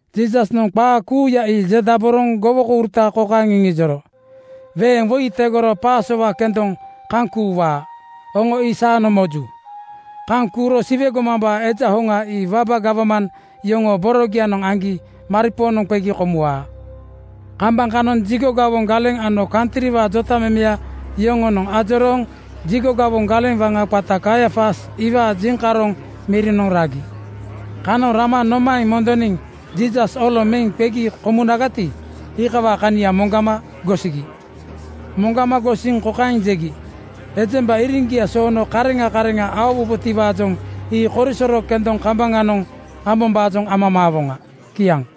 Jiisasnoŋ qaa kuuya ii jedaboroŋ gowokouruta kokaeŋ iŋijoro, “Weeŋ woi tegorogo pasowa kendoŋa kaŋ kuuwaa. Oŋo ii saanoŋ moju. Kaŋ kuuro Siwe gomambaa Eja hoŋa ii waba gawman yoŋoo borogianoŋ aŋgi maripoonoŋ qegi komuwaa.” Kambaŋ kanoŋ jigo gawoŋ galeŋ ano kantriwaa jotamemeya yoŋonoŋ ajorooŋ jigo gawoŋ galeŋ waŋa qata Kaiafas iwaa jiŋkaroŋ mirianoŋ ragi. Kanoŋ rama nomaeŋ mondoniŋ Jiisas oloŋ meŋ qegi komunagati, iikawaa kania moŋgama gosigi. Moŋgama gosiŋ kokaeŋ jegi, “Ejemba iriŋgia soono kareŋa kareŋa aowubotiwaajoŋ ii korisoro kendoŋ kambaŋanoŋ ambombaajoŋ amamaawoŋa.” Kiaŋ.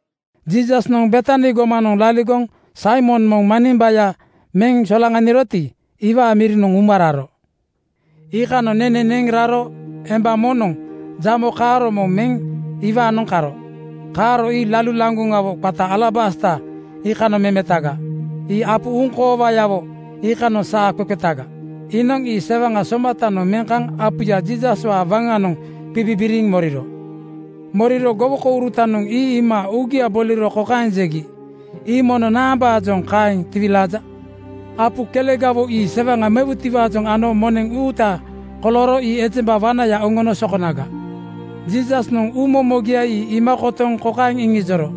Jiisasnoŋ Betani gomanoŋ laligoŋ Saimon moŋ manimbaya meŋ solaŋaniroti, iwaa mirinoŋ uma raro. Iikanoŋ nene neŋ raro emba moŋnoŋ jamo kaaro moŋ meŋ iwaanoŋ karo. Kaaro ii lalu laŋgoŋawo qata alabasta iikanoŋ memetaga. Ii apu uuŋkoowagawo iikanoŋ saa qeqetaga. Iinoŋ ii sewaŋa somatanoŋ meŋ kaŋ apuya Jiisaswaa waŋanoŋ qibibiriŋ moriro. Moriro gowokourutanoŋ ii iima uugia boliro kokaeŋ jegi, “Ii mono naambaajoŋ kaeŋ tiwilaaja? Apu kelegawo ii sewaŋa mewutiwaajoŋ ano moneŋ uuta kolooro ii ejemba wanaya oŋono sokonaga.” Jiisasnoŋ uumomogia ii iima kotoŋ kokaeŋ iŋijoro,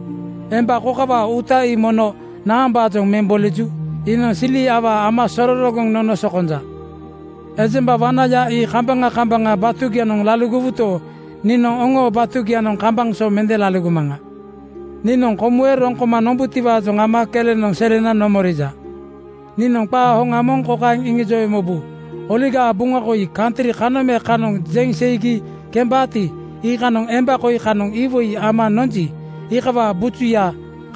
“Emba kokawaa uuta ii mono naambaajoŋ meŋ boliju? Iinoŋ sili awaa ama sororogoŋ nono sokonja. Ejemba wanaya ii kambaŋa kambaŋa batugianoŋ laligowuto, niinoŋ oŋoo batugianoŋ kambaŋ so mende laligomaŋa. Niinoŋ komuwe roŋ koma nombutiwaajoŋ ama kelenoŋ selena nomorija. Niinoŋ qaa hoŋa moŋ kokaeŋ iŋijowe mobu: Oligaa Buŋa koi kantri kanoŋ me kanoŋ jeŋ seigi kembaati, iikanoŋ emba koi kanoŋ iwoi ama nonji, iikawaa bujuya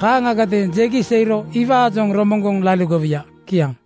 kaaŋgadeeŋ jegi seiro iwaajoŋ romoŋgoŋ laligowuya.” Kiaŋ.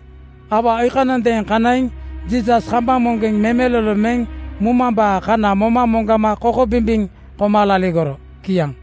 Aua iikanondeeŋ kanaiŋ Jiisas kambaŋ moŋgeŋ memelolo meŋ mumambaa kana moma moŋgama kokobimbiŋ koma laligoro. Kiaŋ.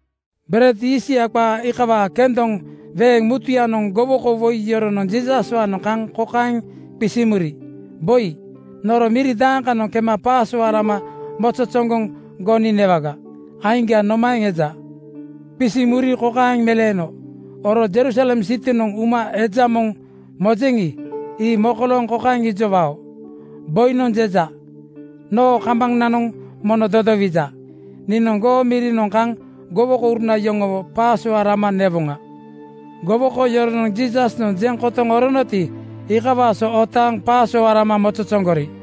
Bered yiistya qaa iikawaa kendoŋ weeŋ mutuyanoŋ (Sikunenenoŋ) gowoko woi yoronoŋ Jiisaswaanoŋ kaŋ kokaeŋ qisiŋ muri, “Boi, nono miri dakanoŋ kema pasowa lama mozozoŋgoŋ goni newaga? Aiŋga nomaeŋ eja?” Qisiŋ muri kokaeŋ meleeno, “Oro Jerusalem sitinoŋ uma eja moŋ mojeŋi, ii mokolooŋ kokaeŋ ijowao, ‘Boinoŋ jeja: Noo kambananoŋ mono dodowija. Niinoŋ goo mirinoŋ kaŋ gowokouruna yoŋowo Pasowa lama newoŋa.” ’ Gowoko yoronoŋ Jiisasnoŋ jeŋ kotoŋ oronoti, iikawaa so otaaŋ Pasowa lama mozozoŋgori.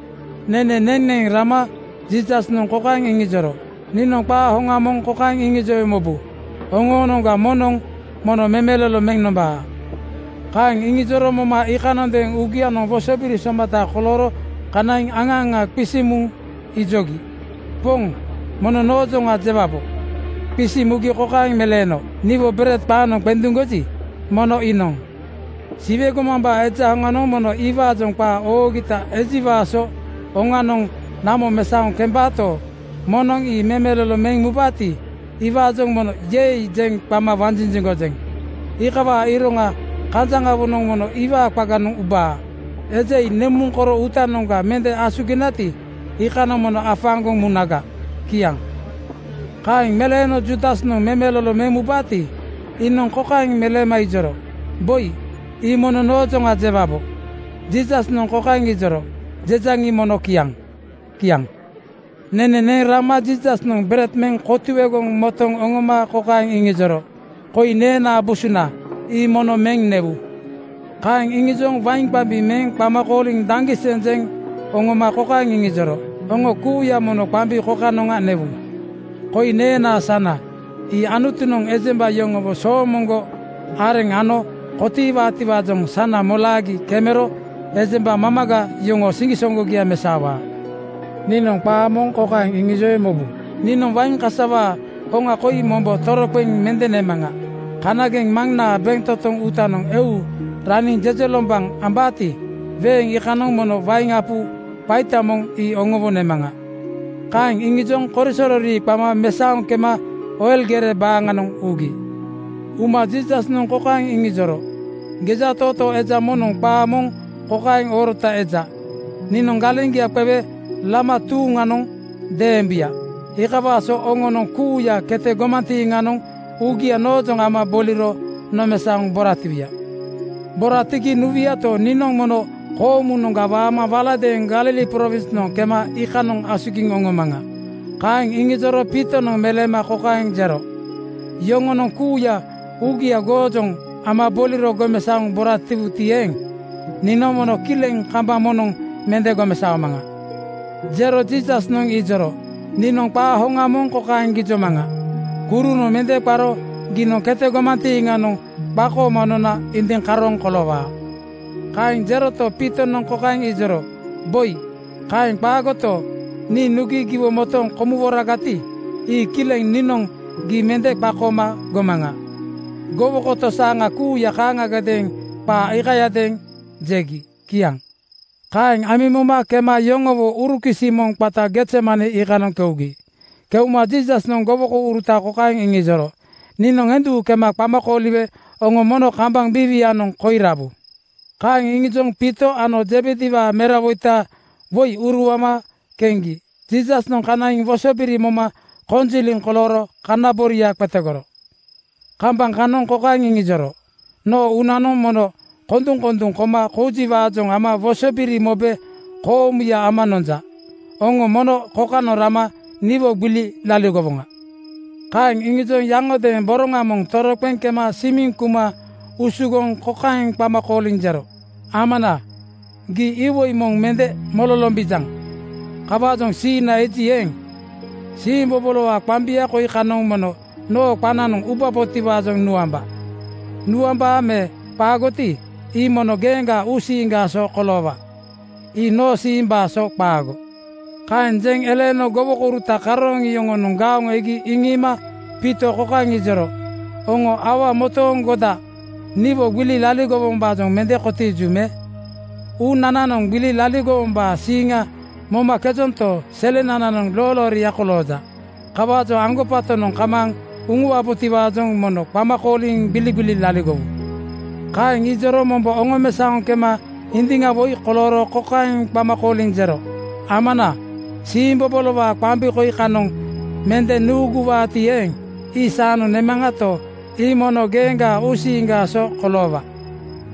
Nene neŋ neŋ rama Jiisasnoŋ kokaeŋ iŋijoro, “Niinoŋ qaa hoŋa moŋ kokaeŋ iŋijowe mobu: Oŋoonoŋga moŋnoŋ mono memelolo meŋ nombaa.” Kaeŋ iŋijoro moma iikanondeeŋ uugianoŋ wosobiri somata kolooro kanaiŋ aŋa aŋa qisiŋ muŋ ijogi, “Poŋ, mono noojoŋa jewabo?” Qisiŋ mugi kokaeŋ meleeno, “Niwo bered qaaŋnoŋ qenduŋgoji, mono iinoŋ. Siwe gomambaa Eja hoŋanoŋ mono iwaajoŋ qaa oogita ejiwaa so oŋanoŋ namo mesaoŋ kembaato, moŋnoŋ ii memelolo meŋ mubaati, iwaajoŋ mono ‘Yei!’ jeŋ qama wanjinjiŋgojeŋ. Iikawaa iroŋa kanjaŋawonoŋ mono iwaa qaganoŋ ubaa. Eja ii nemuŋ koro uutanoŋga mende asuginagati, iikanoŋ mono afaaŋgoŋ munaga.” Kiaŋ. Kaeŋ meleeno Juudas memelolo meŋ mubaati, iinoŋ kokaeŋ meleema ijoro, “Boi, ii mono noojoŋa jewabo?” Jiisasnoŋ kokaeŋ ijoro, “Jejaŋi, mono kiaŋ!” Kiaŋ. Nene neŋ rama Jiisasnoŋ bered meŋ kotuegoŋ motoŋ oŋoma kokaeŋ iŋijoro, “Koi neenaa busuna. Ii mono meŋ newu.” Kaeŋ iŋijoŋ wain qambi meŋ qama kooliŋ daŋgiseŋ jeŋ oŋoma kokaeŋ iŋijoro, “Oŋo kuuya mono qambi kokanoŋa newu. Koi neenaa sana. Ii Anutunoŋ ejemba yoŋowo soomoŋgo areŋ ano kotiiwaatiwaajoŋ sana molaagi kemero ejemba mamaga yoŋoo siŋgisoŋgogia mesaowaa. Niinoŋ qaa moŋ kokaeŋ iŋijowe mobu: Niinoŋ wain kasawaa hoŋa koi mombo toroqeŋ mende nemaŋa. Kanageŋ Maŋnaa bentotoŋ uutanoŋ eu raniŋ jejelombaŋ ambaati, weeŋ iikanoŋ mono wain apu qaita moŋ ii oŋowo nemaŋa.” Kaeŋ iŋijoŋ korisoro rii qama mesaoŋ kema Oil gere baaŋanoŋ ugi. Uma Jiisasnoŋ kokaeŋ iŋijoro, “Gejatootoo eja moŋnoŋ qaa moŋ kokaeŋ oorota eja, ‘Niinoŋ galeŋgia qewe lama tuuŋanoŋ deembuya.’ Iikawaa so oŋonoŋ kuuya kete gomantiiŋanoŋ uugia noojoŋ ama boliro nomesaoŋ boratiwuya. Boratigi nuwuyato, niinoŋ mono koomunoŋga waama waladeeŋ Galili prowinsnoŋ kema iikanoŋ asugiŋ oŋomaŋa Kaeŋ iŋijoro Piitonoŋ meleema kokaeŋ jero, “Yoŋonoŋ kuuya uugia goojoŋ ama boliro gomesaoŋ boratiwuti eeŋ, niinoŋ mono kileŋ kambaŋ moŋnoŋ mende gomesaomaŋa.” Jero Jiisasnoŋ ijoro, “Niinoŋ qaa hoŋa moŋ kokaeŋ gijomaŋa: Kurunoŋ mende qaro giinoŋ kete gomantiiŋanoŋ qakooma nona indiŋ karooŋ koloowaa.” Kaeŋ jeroto, Piitonoŋ kokaeŋ ijoro, “Boi, kaeŋ qaagoto, nii nugi giwo motooŋ komuworagati, ii kileŋ niinoŋ gii mende qakooma gomaŋa.” Gowoko tosaaŋa kuuya kaaŋagadeeŋ qaa iikayadeeŋ jegi. Kiaŋ. Kaeŋ amiŋ moma kema yoŋowo urukisi moŋ qata Gezemane iikanoŋ keugi. Keuma Jiisasnoŋ gowokouruta kokaeŋ iŋijoro, “Niinoŋ endu kema qama kooliwe oŋo mono kambaŋ biiwianoŋ koi rabu.” Kaeŋ iŋijoŋ Piito ano Zebediwaa merawoita woi uruama keŋgi Jiisasnoŋ kanaiŋ wosobiri moma konjiliŋ kolooro kana boria qetegoro. Kambaŋ kanoŋ kokaeŋ iŋijoro, “Noo uunanoŋ mono konduŋkonduŋ koma koujiwaajoŋ ama wosobiri mobe koomuya ama nonja. Oŋo mono kokanoŋ rama niwo gbili laligowoŋa.” Kaeŋ iŋijoŋ yaŋodeeŋ boroŋa moŋ toroqeŋ kema simiŋ kuma usugoŋ kokaeŋ qama kooliŋ jero, “Amana, gii iwoi moŋ mende mololombijaŋ. Kawaajoŋ siiŋga eji eeŋ, siimbobolowaa qambia koi kanoŋ mono noo qananoŋ ubabotiwaajoŋ nuamba. Nuambaa me qaagoti, ii mono geeŋgaa uusiiŋgaa so koloowa. Ii noo siimbaa so qaago!” Kaeŋ jeŋ eleeno gowokouruta karooŋ yoŋonoŋ gaoŋ egi iŋiima Piito kokaeŋ ijoro, “Oŋo aua motooŋgoda niwo gbili laligowombaajoŋ mende kotiiju me? Uunananoŋ gbili laligowombaa siiŋa momakejonto, selenananoŋ loolooria kolooja. Kawaajoŋ aŋgobatonoŋ kamaaŋ uŋuwabotiwaajoŋ mono qama kooliŋ gbiligbili laligowu.” Kaeŋ ijoro mombo oŋomesaoŋ kema indiŋ woi kolooro kokaeŋ qama kooliŋ jero, “Amana, siimbobolowaa qambi koi kanoŋ mende nuuguwaati eeŋ, ii saanoŋ nemaŋato, ii mono geeŋgaa uusiiŋgaa so koloowa.”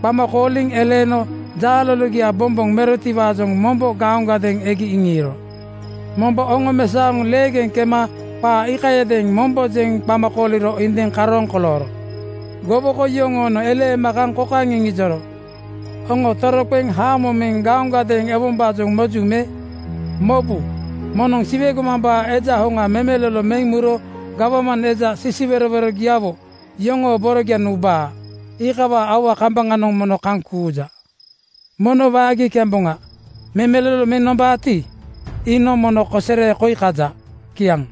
Qama kooliŋ eleeno jaa lologia bomboŋ merotiwaajoŋ mombo gaoŋgadeeŋ egi iŋiiro. Mombo oŋomesaoŋ leegeŋ kema qaa iikayadeeŋ mombo jeŋ qama kooliro indiŋ karooŋ kolooro. Gowoko yoŋoonoŋ eleema kaŋ kokaeŋ iŋijoro, “Oŋo toroqeŋ haamo meŋ gaoŋgadeeŋ ewombaajoŋ moju me? Mobu! Moŋnoŋ Siwe gomambaa Eja hoŋa memelolo meŋ muro gawman eja sisiwerowerogiawo yoŋoo borogianoŋ ubaa. Iikawaa aua kambaŋanoŋ mono kaŋ kuuja. Mono waagi kemboŋa! Memelolo meŋ nombaati, iinoŋ mono kosere koi kaja.” Kiaŋ.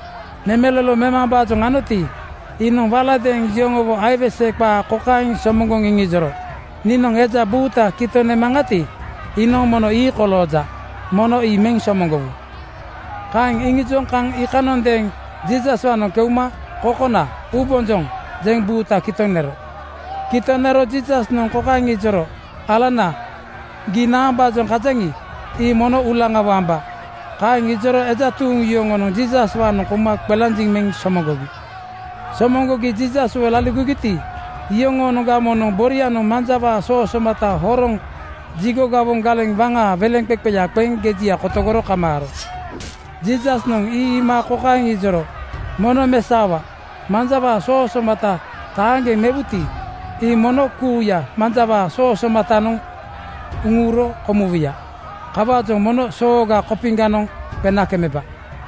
Memelolo memambaajoŋ anoti, iinoŋ waladeeŋ yoŋowo aiwese qaa kokaeŋ somoŋgoŋ iŋijoro, “Niinoŋ eja buuta kitoŋ nemaŋati, iinoŋ mono ii kolooja. Mono ii meŋ somoŋgowu.” Kaeŋ iŋijoŋ kaŋ iikanondeeŋ Jiisaswaanoŋ keuma “Kokona (Boi), uubonjoŋ!” jeŋ buuta kitoŋ nero. Kitoŋ nero Jiisasnoŋ kokaeŋ ijoro, “Alana, gii naambaajoŋ kajaŋi, ii mono uulaŋawo amba.” Kaeŋ ijoro eja tuuŋ yoŋonoŋ Jiisaswaanoŋ kouma qelanjiŋ meŋ somoŋgogi. Somoŋgogi Jiisaswo laligogiti, iyoŋoonoŋga moŋnoŋ borianoŋ manjawaa soo somata horoŋ jigo gawoŋ galeŋ waŋaa weleŋqeqeya qeŋ gejia kotogoro kamaaro. Jiisasnoŋ ii iima kokaeŋ ijoro, “Mono mesaowa! Manjawaa soo somata taaŋgeŋ mewuti, ii mono kuuya manjawaa soo somatanoŋ uŋuro komuwuya. Kawaajoŋ mono sooga kopiŋanoŋ qena kemeba!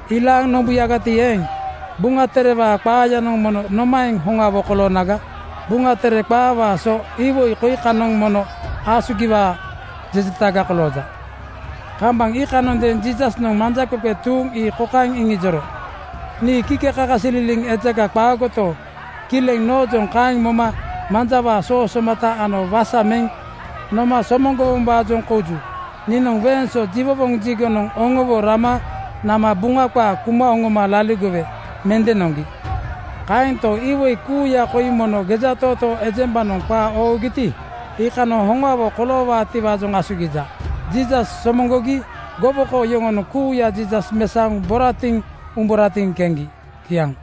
Ilaaŋ nombuyagati eeŋ, Buŋa Terewaa qaayanoŋ mono nomaeŋ hoŋawo koloonaga? Buŋa Tere qaawaa so iwoi koi kanoŋ mono asugiwaa jejetaga kolooja.” Kambaŋ iikanondeeŋ Jiisasnoŋ manjaqeqe tuuŋ ii kokaeŋ iŋijoro, “Nii kikekakasililiŋ ejaga qaagoto, kileŋ noojoŋ kaeŋ moma manjawaa soo somata ano wasa meŋ noma somoŋgowombaajoŋ kouju. Niinoŋ weeŋ so jiwowoŋ jigonoŋ oŋowo rama nama Buŋa qaa kuma oŋoma laligowe mende noŋgi. Kaento, iwoi kuuya koi mono gejatootoo ejembanoŋ qaa oogiti, iikanoŋ hoŋawo koloowaatiwaajoŋ asugija.” Jiisas somoŋgogi gowoko yoŋonoŋ kuuya Jiisas mesaoŋ boratiŋ umburatiŋ keŋgi. Kiaŋ.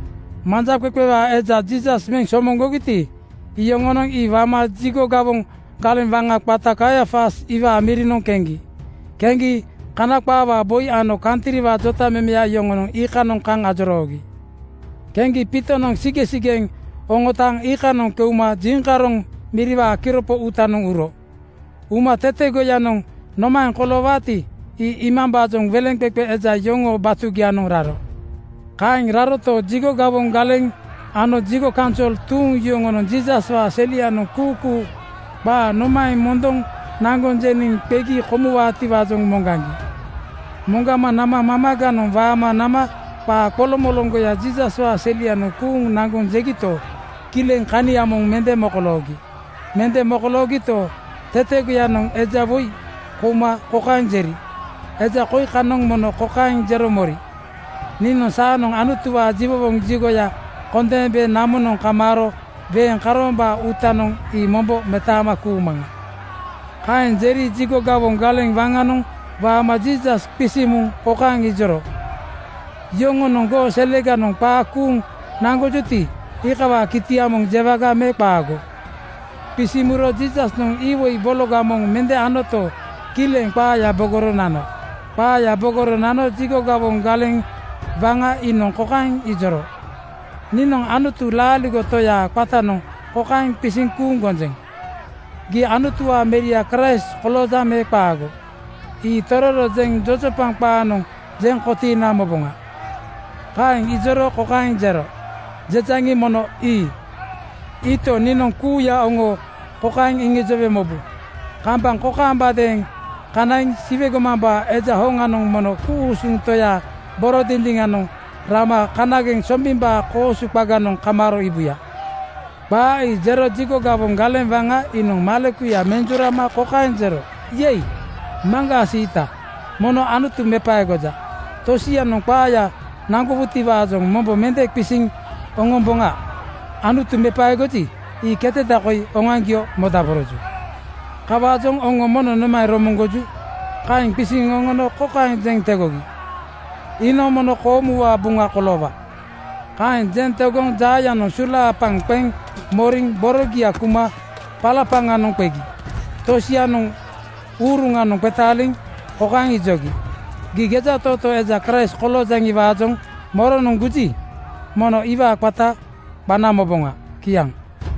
Manjaqeqe eja Jiisas meŋ somoŋgogiti, iyoŋonoŋ ii wama jigo gawoŋ galeŋ waŋa qata Kaiafas iwaa mirinoŋ keŋgi. Keŋgi Kana qaawaa boi ano kantriwaa jotamemeya yoŋonoŋ iikanoŋ kaŋ ajoroogi. Keŋgi Piitonoŋ sigeŋsigeŋ oŋotaaŋ iikanoŋ keuma jiŋkaroŋ miriwaa kiropo uutanoŋ uro. Uma tetegoyanoŋ nomaeŋ koloowaati, ii iimambaajoŋ weleŋqeqe eja yoŋoo batugianoŋ raro. Kaeŋ raroto, jigo gawoŋ galeŋ ano jigo kaunsol tuuŋ yoŋonoŋ Jiisaswaa selenoŋ kuukuu qaa nomaeŋ mondoŋ naŋgoŋ jeniŋ qegi komuwaatiwaajoŋ moŋgaŋgi. Moŋgama nama mamaganoŋ waama nama qaa qoloŋmoloŋgoya Jiisaswaa selianoŋ kuuŋ naŋgoŋ jegito, kileŋ kania moŋ mende mokoloogi. Mende mokoloogito, tetegoyanoŋ eja woi kouma kokaeŋ jeri, “Eja koi kanoŋ mono kokaeŋ jero mori, ‘Nii saanoŋ Anutuwaa jiwowoŋ jigoya kondeembe namonoŋ kamaaro weeŋ karoombaa uutanoŋ ii mombo metaama kuumaŋa.” ’ Kaeŋ jeri jigo gawoŋ galeŋ waŋanoŋ waama Jiisas qisiŋ muŋ kokaeŋ ijoro, “Yoŋonoŋ goo seleganoŋ qaa kuuŋ naŋgojuti, iikawaa kitia moŋ jewaga me qaago?” Qisiŋ muro Jiisasnoŋ iwoi bologa moŋ mende anoto, kileŋ qaaya bogoro nano. Qaaya bogoro nano jigo gawoŋ galeŋ waŋa iinoŋ kokaeŋ ijoro, “Niinoŋ Anutu laaligo Toyaa qatanoŋ kokaeŋ qisiŋ kuuŋ gonjeŋ: Gii Anutuwaa Meria Kraist koloojaŋ me qaago, ii tororo jeŋ jojopaŋ qaanoŋ jeŋ kotiina moboŋa.” Kaeŋ ijoro kokaeŋ jero, “Jejaŋi, mono ii. Iito, niinoŋ kuuya oŋo kokaeŋ iŋijowe mobu: Kambaŋ kokaambadeeŋ kanaiŋ Siwe gomambaa Eja hoŋanoŋ mono ku-usuŋ Toyaa boro dindiŋanoŋ rama kanageŋ sombimbaa koosu qaganoŋ kamaaro iibuya.” Qaa ii jero jigo gawoŋ galeŋ waŋa iinoŋ malekuya menjurama kokaeŋ jero, “Yei, maŋgaa siita! Mono Anutu mepaegoja. Tosianoŋ qaaya naŋgowutiwaajoŋ mombo mende qisiŋ oŋomboŋa. Anutu mepaegoji, ii keteda koi oŋoaŋgio modaboroju. Kawaajoŋ oŋo mono nomaeŋ romoŋgoju?” Kaeŋ qisiŋ oŋono kokaeŋ jeŋ tegogi, “Iinoŋ mono koomuwaa buŋa koloowa.” Kaeŋ jeŋ tegoŋ jaayanoŋ sulaapaŋ qeŋ moriŋ borogia kuma palapaŋanoŋ qegi. Tosianoŋ uruŋanoŋ qetaaliŋ kokaeŋ ijogi, “Gii gejatootoo eja Kraist koloojaŋiwaajoŋ moronoŋ guji, mono iwaa qata qana moboŋa.” Kiaŋ.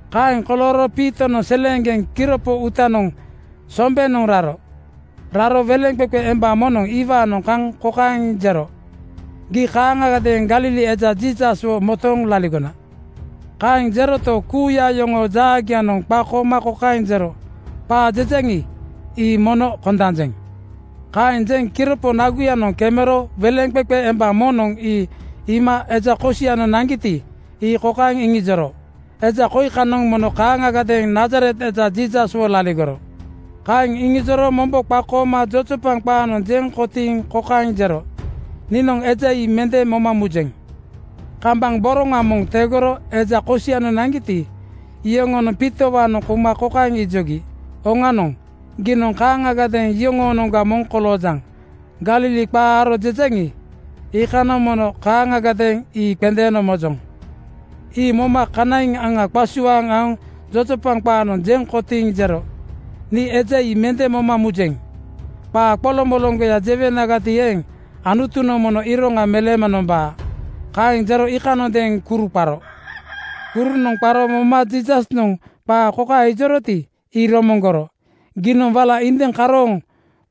Kaeŋ kolooro Piitonoŋ seleeŋgeŋ kiropo uutanoŋ sombenoŋ raro. Raro weleŋqeqe emba moŋnoŋ iwaanoŋ kaŋ kokaeŋ jero, “Gii kaaŋagadeeŋ Galili eja Jiisaswo motooŋ laligona.” Kaeŋ jeroto, kuuya yoŋoo jaagianoŋ qakooma kokaeŋ jero, “Qaa jejaŋi, ii mono kondanjeŋ.” Kaeŋ jeŋ kiropo naguyanoŋ kemero weleŋqeqe emba moŋnoŋ ii iima eja kosianoŋ naŋgiti, ii kokaeŋ iŋijoro, “Eja koi kanoŋ mono kaaŋagadeeŋ Nazaret eja Jiisaswo laligoro.” Kaeŋ iŋijoro mombo qakooma jojopaŋ qaanoŋ jeŋ kotiiŋ kokaeŋ jero, “Niinoŋ eja ii mende moma mujeŋ.” Kambaŋ boroŋa moŋ tegoro eja kosianoŋ naŋgiti, iyoŋonoŋ Piitowaanoŋ kouma kokaeŋ ijogi, “Oŋanoŋ! Giinoŋ kaaŋagadeeŋ yoŋoonoŋga moŋ koloojaŋ! Galili qaa aro jejaŋi, iikanoŋ mono kaaŋagadeeŋ ii qendeeno mojoŋ.” Ii moma kanaiŋ aŋa qasuaaŋ aoŋ jojopaŋ qaanoŋ jeŋ kotiiŋ jero, “Nii eja ii mende moma mujeŋ! Qaa qoloŋmoloŋgoya jewenagati eeŋ, Anutunoŋ mono iroŋa meleema nomba.” Kaeŋ jero iikanondeeŋ kuru qaro. Kurunoŋ qaro moma Jiisasnoŋ qaa kokaeŋ ijoroti, ii romoŋgoro, “Giinoŋ wala indiŋ karooŋ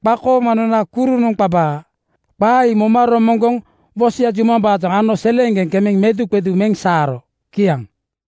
qakooma nona kurunoŋ qabaa.” Qaa ii romoŋgoŋ wosoya jumambaajoŋ ano seleeŋgeŋ kemeŋ meduqedu meŋ saaro. Kiaŋ.